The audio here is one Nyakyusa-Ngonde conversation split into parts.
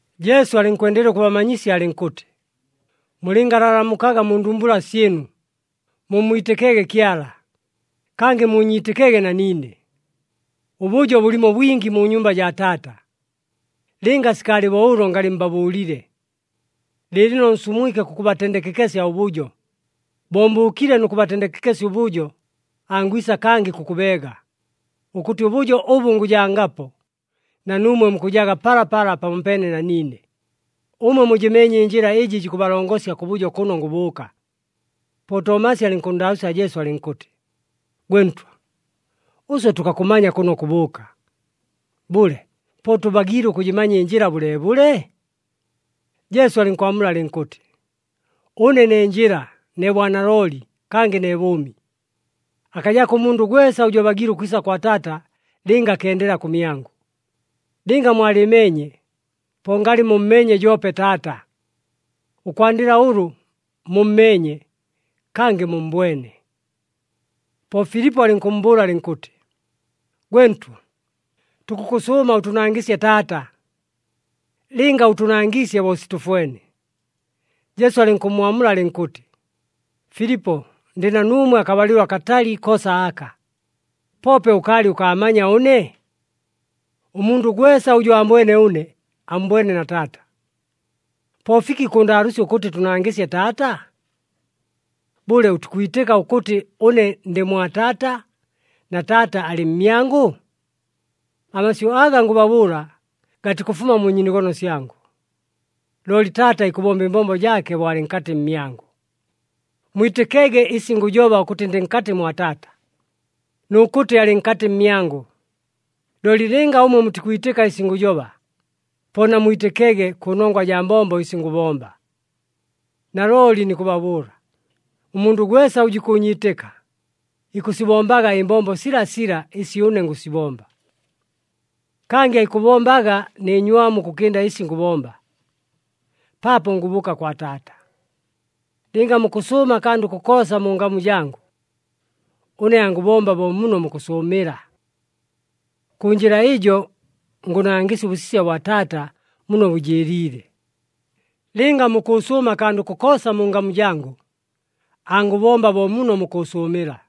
Jesu alɨnkwendelela ʉkʉbamanyisya alɨnkʉtɨ, “Mulɨngalalamukaga mu ndumbula syɨnu, mummwitɨkege Kyala, kangɨ muunyiitɨkege na niine. Ʉbʉjo bʉlimo bwingi mu nyumba jaa Taata. Lɨnga sikaalɨ bo ʉlo, ngalɨ mbabʉʉlile. Lɨɨlɨno nsumwike kʉkʉbatendekekesya ʉbʉjo. Bo mbʉʉkile nʉ kʉbatendekekesya ʉbʉjo, angwisa kangɨ kʉkʉbeega, ʉkʉtɨ ʉbʉjo ʉbʉ ngʉjangapo, na nuumwe mukʉjaga palapala pamopeene na niine. Ʉmwe mujɨmeenye ɨnjɨla ɨjɨ jikʉbalongosya kʉbʉjo kʉno ngʉbʉʉka.” Po Tomasi alɨnkʉnndaalʉʉsya Jesu alɨnkʉtɨ, “Gwe Ntwa, ʉswe tʉkakʉmanya kʉno kʉbʉʉka. Bʉle, po tʉbagiile ʉkʉjɨmanya ɨnjɨla bʉleebʉle?” Jesu alɨnkwamula alɨnkʉtɨ, “Ʉne ne njɨla, ne bwanalooli, kangɨ ne bʉʉmi. Akajako ʉmundʉ gwesa ʉjʉ abagiile ʉkwisa kwa Taata lɨnga akendela kʉmyangʉ. Lɨnga mwalɨɨmeenye, po ngalɨ mummeenye joope Taata. Ʉkwandɨla ʉlʉ, mummeenye, kangɨ mummbwene.” Po Filipo alɨnkʉmmbʉʉla alɨnkʉtɨ, “Gwe Ntwa, tukʉkʉsʉʉma ʉtʉnangɨsye Taata. Lɨnga ʉtʉnangiisye bo sitʉfwene.” Jesu alɨnkʉmmwamula alɨnkʉtɨ, “Filipo, ndɨ na nuumwe akabalɨlo akatali koosa aka, poope ʉkaalɨ ʉkaamanya ʉne? Ʉmundʉ gwesa ʉjʉ aambwene ʉne, ammbwene na Taata. Po fiki kʉʉndaalʉʉsya ʉkʉtɨ, ‘Tʉnangɨsye Taata?’ Bʉle, ʉtikwitɨka ʉkʉtɨ ʉne ndɨ mwa Taata, na Taata alɨ mmyangʉ? Amasyʉ aga ngʉbabʉʉla gatikʉfuma mu nyiinogono syangʉ, looli Taata ikʉbomba ɨmbombo jaake bo alɨ nkatɨ mmyangʉ. Mwitɨkege ɨsi ngʉjoba ʉkʉtɨ ndɨ nkatɨ mwa Taata, nʉ kʉtɨ alɨ nkatɨ mmyangʉ. Looli lɨnga ʉmwe mutikwitɨka ɨsi ngʉjoba, po namwitɨkege kʉnongwa jaa mbombo ɨsi ngʉbomba. Nalooli nikʉbabʉʉla, ʉmundʉ gwesa ʉjʉ ikʉʉnyiitɨka, ikʉsibombaga ɨmbombo silasila ɨsi ʉne ngʉsibomba. Kangɨ aikʉbombaga nɨ nywamu ʉkʉkɨnda ɨsi ngʉbomba, paapo ngʉbʉʉka kwa Taata. Lɨnga mukʉsʉʉma akandʉ kokoosa mu ngamu jangʉ, ʉne angʉbomba bo muno mukʉsʉʉmɨla. Kʉ njɨla ɨjo, ngʉnangɨsya ʉbʉsisya bwa Taata muno bʉjɨɨliile. Lɨnga mukʉʉsʉʉma akandʉ kokoosa mu ngamu jangʉ, angʉbomba bo muno mukʉsʉʉmɨla.”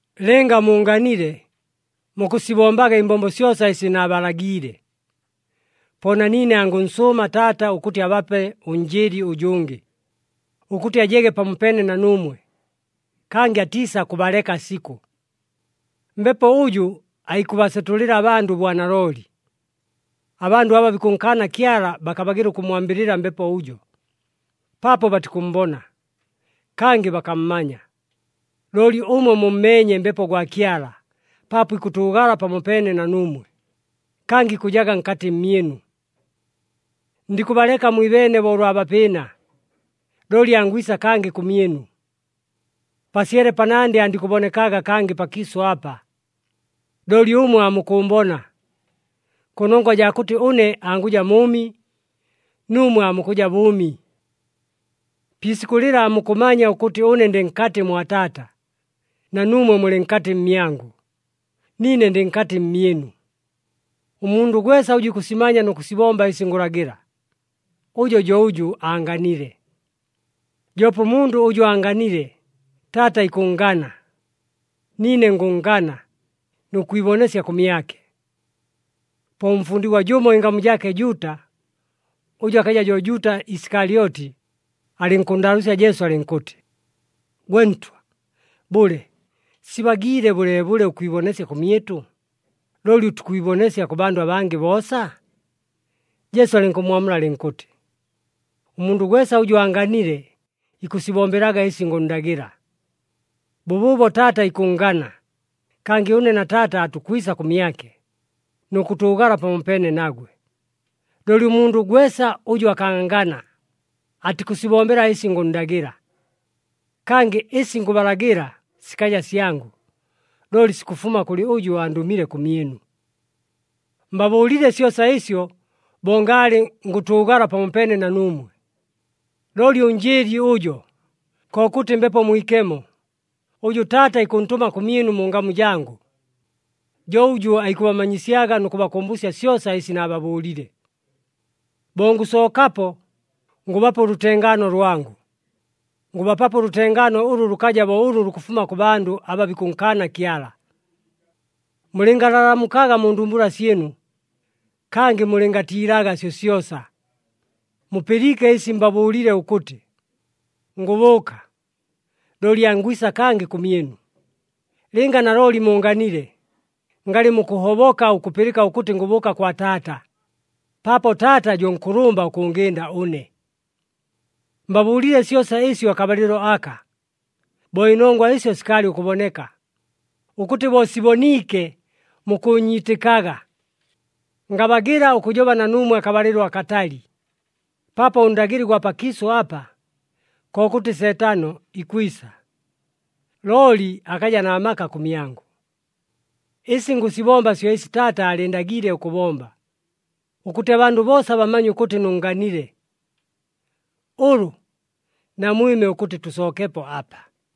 “Lɨnga muunganile mukʉsibombaga ɨmbombo syosa ɨsi naabalagiile. Po na niine angʉnsʉʉma Taata ʉkʉtɨ abape ʉNjɨɨli ʉjʉngɨ, ʉkʉtɨ ajege pamopeene na nuumwe, kangɨ atiisakʉbaleka sikʉ. Mbepo ʉjʉ aikʉbasetʉlɨla abandʉ ʉbwanalooli. Abandʉ aba bikʉnkaana Kyala bakabagɨla ʉkʉmmwambɨlɨla Mbepo ʉjo, paapo batikʉmmbona, kangɨ bakammanya. Looli ʉmwe mummeenye Mbepo gwa Kyala paapo ikʉtʉʉgala pamopeene na nuumwe, kangɨ ikʉjaga nkatɨ mmyɨnu. “Ndikʉbaleka mwibeene bo ʉlwa bapɨɨna, looli angwisa kangɨ kʉmyɨnu. Pasyele panandɨ andikʉbonekaga kangɨ pakiisʉ apa. Looli ʉmwe aamukʉʉmbona. Kʉnongwa jaa kʉtɨ ʉne angʉja mʉʉmi, nuumwe aamukʉja bʉʉmi. Pi isikʉ lɨla, aamukʉmanya ʉkʉtɨ ʉne ndɨ nkatɨ mwa Taata, na nuumwe mulɨ nkatɨ mmyangʉ, niine ndɨ nkatɨ mmyɨnu. Ʉmundʉ gwesa ʉjʉ ikʉsimanya nʉ kʉsibomba ɨsi ngʉlagɨla, ʉjo jo ʉjʉ aanganile. Joope ʉmundʉ ʉjʉ aanganile, Taata ikʉnngana. Niine ngʉnngana nʉ kwibonesya kʉmyake.” Po ʉmfundigwa jʉmo ɨngamu jaake Juuta, ʉjʉ akaja jo Juuta Isikalyoti, alɨnkʉnndaalʉʉsya Jesu alɨnkʉtɨ, “Gwe Ntwa, bʉle, sibagiile bʉleebʉle ʉkwibonesya kʉmyɨtʉ, looli ʉtikwibonesya kʉ bandʉ abangɨ boosa?” Jesu alɨnkʉmmwamula alɨnkʉtɨ, “Ʉmundʉ gwesa ʉjʉ aanganile ikʉsibombelaga ɨsi ngʉnndagɨla. Bʉbʉʉbo Taata ikʉnngana, kangɨ ʉne na Taata aatukwisa kʉmyake, nʉ kʉtʉʉgala pamopeene nagwe. Looli ʉmundʉ gwesa ʉjʉ akaangana, atikʉsibombela ɨsi ngʉnndagɨla. Kangɨ, ɨsi ngʉbalagɨla sikaja syangʉ, looli sikʉfuma kʉlɨ ʉjʉ andʉmile kʉmyɨnu. “Mbabʉʉlile syosa ɨsyo bo ngaalɨ ngʉtʉʉgala pamopeene na nuumwe. Looli ʉNjɨɨli ʉjo, kokʉtɨ Mbepo Mwikemo, ʉjʉ Taata ikʉntʉma kʉmyɨnu mu ngamu jangʉ, jo ʉjʉ aikʉbamanyisyaga nʉ kʉbakʉmbʉsya syosa ɨsi naababʉʉlile. Bo ngʉsookapo, ngʉbapa ʉlʉtengaano lwangʉ. Ngʉbapapo ʉlʉtengaano ʉlʉ lʉkaja bo ʉlʉ lukʉfuma kʉ bandʉ aba bikʉnkaana Kyala. Mulɨngalalamukaga mu ndumbula syɨnu, kangɨ mulɨngatiilaga syosyosa. Mupɨliike ɨsi mbabʉʉlile ʉkʉtɨ, ‘Ngʉbʉʉka, looli angwisa kangɨ kʉmyɨnu.’ Lɨnga nalooli muunganile, ngalɨ mukʉhoboka ʉkʉpɨlɨka ʉkʉtɨ ngʉbʉʉka kwa Taata, paapo Taata jo nkʉlʉmba ʉkʉngɨnda ʉne. “Mbabʉʉlile syosa ɨsyo akabalɨlo aka, bo ɨnongwa ɨsyo sikaalɨ ʉkʉboneka, ʉkʉtɨ bo siboniike mukʉʉnyiitɨkaga. Ngabagɨla ʉkʉjoba na nuumwe akabalɨlo akatali, paapo ʉndagɨli gwa pakiisʉ apa, kokʉtɨ Seetano, ikwisa. Looli akaja na maka kʉmyangʉ. Ɨsi ngʉsibomba syo ɨsi Taata aalɨɨndagiile ʉkʉbomba, ʉkʉtɨ abandʉ boosa bamanye ʉkʉtɨ nʉnnganile. Ʉlʉ, namwɨme ʉkʉtɨ tʉsookepo apa.”